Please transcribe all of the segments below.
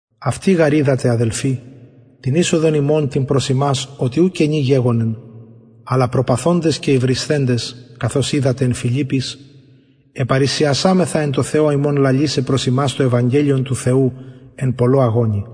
αυτοι γαρ οιδατε αδελφοι την εισοδον ημων την προς υμας οτι ου κενη γεγονεν αλλα προπαθοντες και υβρισθεντες καθως οιδατε εν φιλιπποις επαρρησιασαμεθα εν τω θεω ημων λαλησαι προς υμας το ευαγγελιον του θεου εν πολλω αγωνι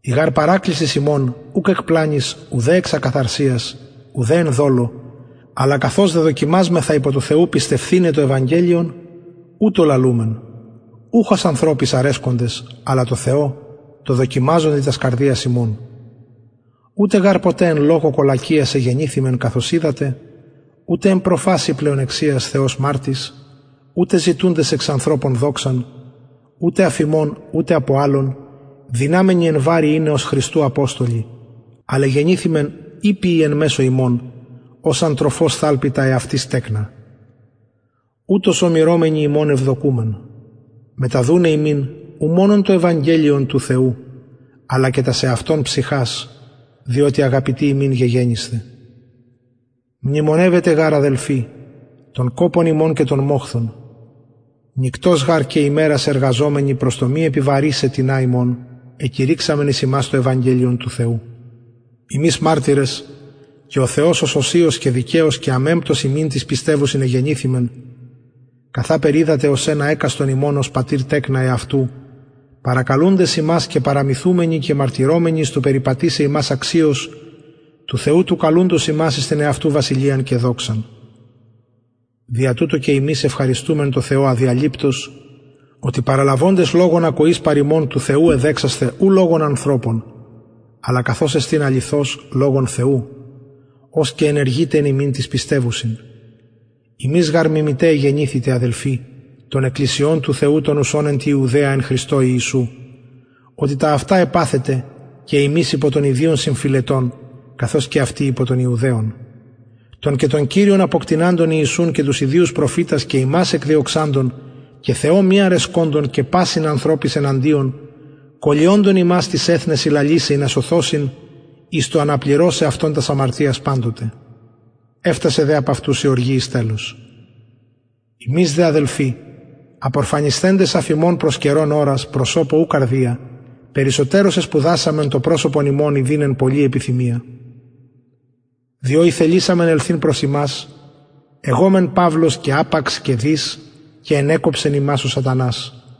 η γαρ παρακλησις ημων ουκ εκ πλανης ουδε εξ ακαθαρσιας ουτε εν δολω αλλα καθως δεδοκιμασμεθα υπο του θεου πιστευθηναι το ευαγγελιον ουτως λαλουμεν ουχ ως ανθρωποις αρεσκοντες αλλα τω θεω τω δοκιμαζοντι τας καρδιας ημων ουτε γαρ ποτε εν λογω κολακειας εγενηθημεν καθως οιδατε ουτε εν προφασει πλεονεξιας θεος μαρτυς ουτε ζητουντες εξ ανθρωπων δοξαν ουτε αφ υμων ουτε απο αλλων δυναμενοι εν βαρει ειναι ως χριστου αποστολοι αλλ εγενηθημεν ηπιοι εν μεσω υμων ως αν τροφος θαλπη τα εαυτης τεκνα ουτως ομειρομενοι υμων ευδοκουμεν μεταδουναι υμιν ου μονον το ευαγγελιον του θεου αλλα και τας εαυτων ψυχας διοτι αγαπητοι ημιν γεγενησθε μνημονευετε γαρ αδελφοι τον κοπον ημων και τον μοχθον νυκτος γαρ και ημερας εργαζομενοι προς το μη επιβαρησαι τινα υμων εκηρυξαμεν εις υμας το ευαγγελιον του θεου υμεις μαρτυρες και ο θεος ως οσιως και δικαιως και αμεμπτως υμιν τοις πιστευουσιν εγενηθημεν καθαπερ οιδατε ως ενα εκαστον υμων ως πατηρ τεκνα εαυτου παρακαλουντες υμας και παραμυθουμενοι και μαρτυρομενοι εις το περιπατησαι υμας αξιως του θεου του καλουντος υμας εις την εαυτου βασιλειαν και δοξαν δια τουτο και ημεις ευχαριστουμεν τω θεω αδιαλειπτως οτι παραλαβοντες λογον ακοης παρ ημων του θεου εδεξασθε ου λογον ανθρωπων αλλα καθως εστιν αληθως λογον θεου ος και ενεργειται εν υμιν τοις πιστευουσιν υμεις γαρ μιμηται εγενηθητε αδελφοι των εκκλησιων του θεου των ουσων εν τη ιουδαια εν χριστω ιησου οτι τα αυτα επαθετε και υμεις υπο των ιδιων συμφυλετων καθως και αυτοι υπο των ιουδαιων των και τον κυριον αποκτειναντων ιησουν και τους ιδιους προφητας και ημας εκδιωξαντων και θεω μη αρεσκοντων και πασιν ανθρωποις εναντιων κωλυοντων ημας τοις εθνεσιν λαλησαι ινα σωθωσιν εις το αναπληρωσαι αυτων τας αμαρτιας παντοτε εφθασεν δε επ αυτους η οργη εις τελος ημεις δε αδελφοι απορφανισθεντες αφ υμων προς καιρον ωρας προσωπω ου καρδια περισσοτερως εσπουδασαμεν το προσωπον υμων ιδειν εν πολλη επιθυμια διο ηθελησαμεν ελθειν προς υμας εγω μεν παυλος και απαξ και δις και ενεκοψεν ημας ο σατανας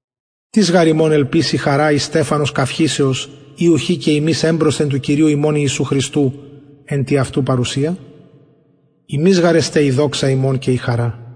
τις γαρ ημων ελπις η χαρα η στεφανος καυχησεως η ουχι και υμεις εμπροσθεν του κυριου ημων ιησου εν τη αυτου παρουσια υμεις γαρ εστε η δοξα ημων και η χαρα